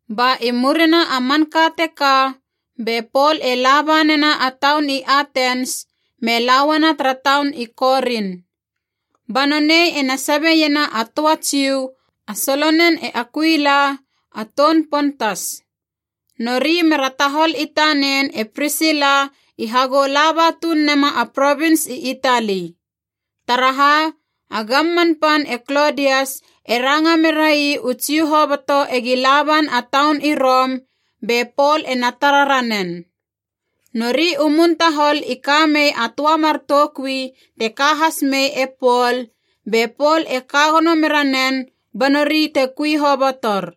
Ba i murina a manka teka be Pol e laba nena a taun i Atens me la uana tara taun i Korin. Ba nonei ena sabeiena a töa Jiu, a solonen e Akuila, a toun Pontas. Nori mera tahol i tanen e Prisila i hagou laba tuun nema a provins i Itali. Taraha, a gamman pan e Klodias e ranga merai u Jiu hoboto egi laban a taun i Rom, be Pol ena tara ranen. Nori u mun tahol i ka mei a töa mar toukui te ka has mei e Pol, be Pol e ka gono mera nen ba nori te kui hobotor.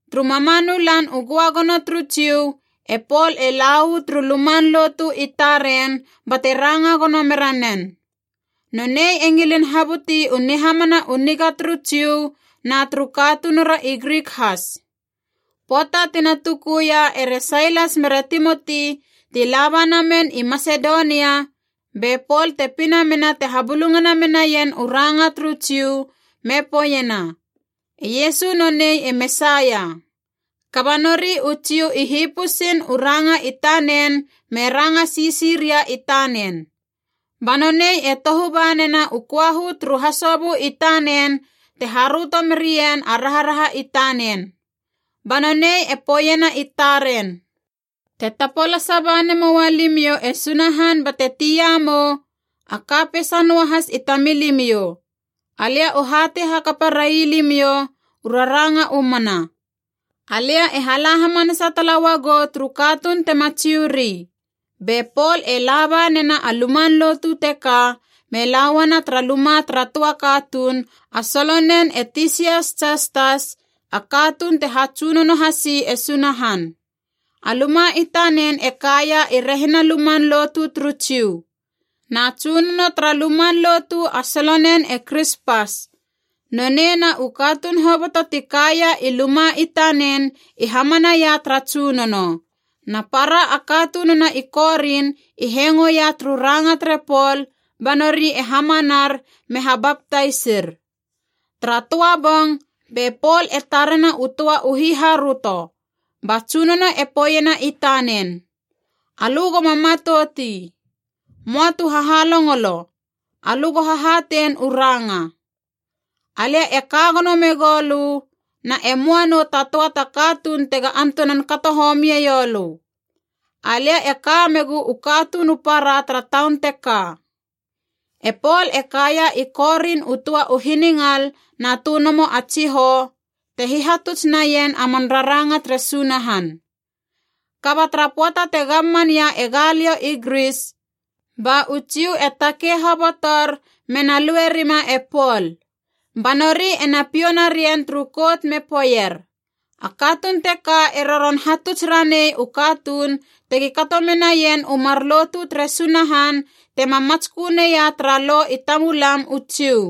Turu mamanu Lan u Göagono turu Jiu e Pol e la uu turu luman lotu i taren bate ranga gono mera nen. Nonei e ngilin habuti u nihamana u niga turu Jiu na turu katunura i Grik has. Pöata tina tukuia ere Sailas mere Timoti ti laba namen i Masedonia be Pol te pina mena te habulungana menaien u ranga turu Jiu me poeiena, “E Iesu nonei e Mesaia.” Kaba nori u Jiu i hipusiin u ranga i tanen me ranga sisi ria i tanen. Ba nonei e tohu ba nena u köahu turu hasobö i tanen te haröto merien a raharaha i tanen. Ba nonei e poeiena i taren, “Te tapolasa ba nemoa limiou e Sunahan bate tiamiou, a ka peisa noahas i tamilimiou. Alia u hatei hakapa railimiou u raranga u mana. Alia e la hamanasa tala uagou turu katuun tema Jiu ri.” Be Pol e laba nena a luman lotu teka, me la uana tara luma tara töa katuun, a solonen e Tisias Jastas, a katuun te hatsunono hasi e Sunahan. A luma i tanen e kaia i rehina luman lotu turu Jiu. Na tsunono tara luman lotu a solonen e Krispas. Nonei na u katuun hoboto ti kaia i luma i tanen i hamana ia tara Tsunono. Na para a katununa i Korin i hengo ia turu ranga tere Pol, ba nori e hamanar me habaptaisir. Tara töa bong be Pol e tarena u töa u hiharöto, ba Tsunono e poeiena i tanen, “Alö goma matouti. Möa tu hahalongolo, alö go hahatein u ranga. Alia e ka gono megou lö, na e möa nou ta töa ta katuun tega antunan kato homie ioulö. Alia e ka megu u katuun u para tara taun teka.” E Pol e kaia i Korin u töa u hiningal na tönomo a tsihou, te hihatuts naien a man raranga tere Sunahan. Kaba tara pöata te gamman ia e Galio i Gris, ba u Jiu e takei hobotor mena luerima e Pol. Ba nori ena piou narien turu kout me poeier, “A katuun teka e roron hatuts ranei u katuun tegi kato menaien u mar lotu tere Sunahan tema matskö neia tara Lo i tamulam u Jiu.”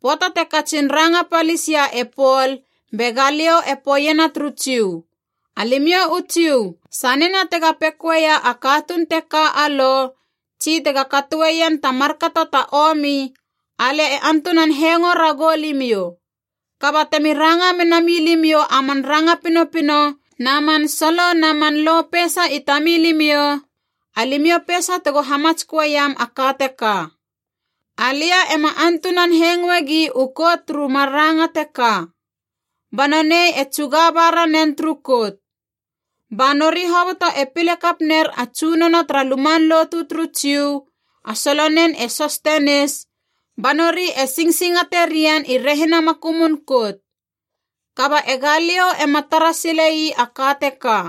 Pöata te katsin ranga palis ia e Pol be Galio e poeiena turu Jiu, “Alimiou u Jiu, sanena tega pekoia a katuun teka a lo, tsi tega katoeien ta markato ta omi, alia e antunan hengo ragou limiou. Kaba temi ranga menamilimiou a man ranga pinopino na man solo na man lo peisa i tamilimiou, alimiou peisa tego hamatsköeiam a ka teka. Alia ema antunan hengoegi u kout turu mar ranga teka.” Ba nonei e tsuga ba ranen turu kout. Ba nori hoboto e pile kap ner a tsunono tara luman lotu turu Jiu, a solonen e Sostenis, ba nori e singsingate rien i rehina makumun kout. Kaba e Galio ema tara sile ii a ka teka.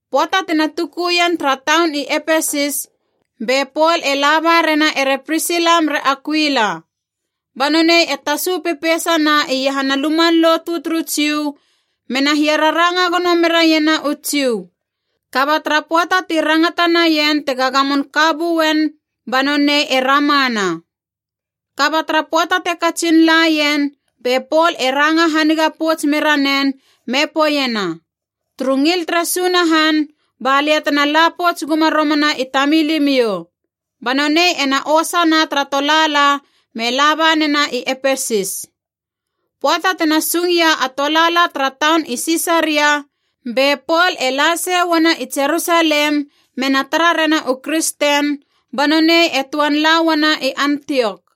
Pöata tina tukuien tara taun i Epesis, be Pol e laba rena ere Prisila mere Akuila. Ba nonei e tasu pepeisana iahana luman lotu turu Jiu mena hiararanga gono mera iena u Jiu. Kaba tara pöata ti rangata naien tega gamon ka buen ba nonei e ramana. Kaba tara pöata te katsin laien be Pol e ranga haniga pouts mera nen me poeiena, “Turu ngil tere Sunahan, balia tena la pouts guma romana i tamilimiou.” Ba nonei ena osana tara tolaala me laba nena i Epesis. Pöata tena sung ia a tolaala tara taun i Sisaria, be Pol e lase uana i Jerusalem mena tara rena u kristen, ba nonei e töan la uana i Antiok.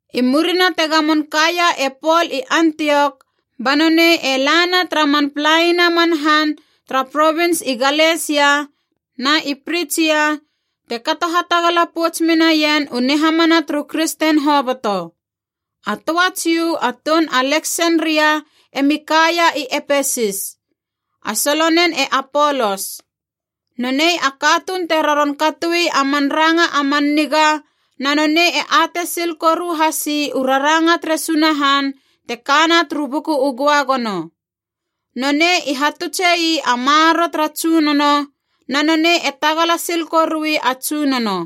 I murina te gamon kaia e Pol i Antiok ba nonei e lana tara man palaina man han tara provins i Galesia na i Pritsia, te kato hatagala pouts menaien u nihamana turu kristen hoboto. A töa Jiu a toun Aleksenria emi kaia i Epesis. A solonen e Apolos. Nonei a katuun te roron katoi a man ranga a man niga, na nonei e atei sil koru hasi u raranga tere Sunahan te kana turu Buku u Göagono. Nonei i hatutse ii a maroro tara Tsunono, na nonei e tagala sil korui a Tsunono.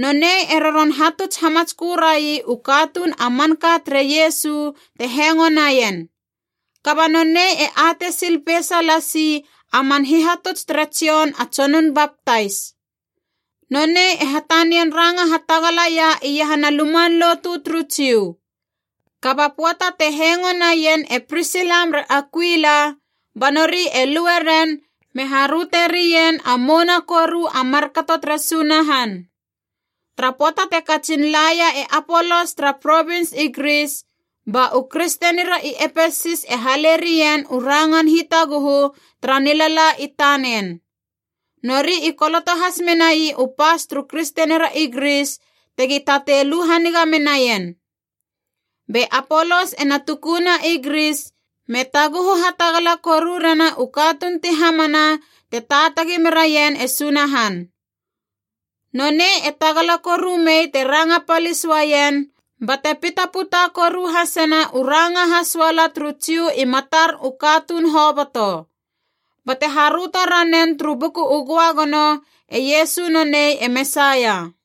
Nonei e roron hatuts hamatskö rai u katuun a manka tere Iesu te hengo naien. Kaba nonei e atei sil peisa lasi a man hihatuts tere Jon a Tsonun Baptais. Nonei e hatanian ranga hatagalaia iahana luman lotu turu Jiu. Kaba pöata te hengo naien e Prisila mere Akuila ba nori e lue ren me haröte rien a mouna koru a markato tere Sunahan. Tara pöata te katsin laia e Apolos tara provins i Gris, ba u kristenira i Epesis e hale rien u rangan hitaguhu tara nilala i tanen. Nori i koloto has menai u pas turu kristenira i Gris tegi tatei lu haniga menaien. Be Apolos ena tukuna i Gris, me taguhu hatagala koru rena u katuun ti hamana te taatagi meraien e Sunahan. Nonei e tagala koru mei te ranga palis uaien, bate pitaputa koru hasena u ranga hasoala turu Jiu i matar u katuun hoboto. Bate haröto ranen turu Buku u Göagono, e Iesu nonei e Mesaia.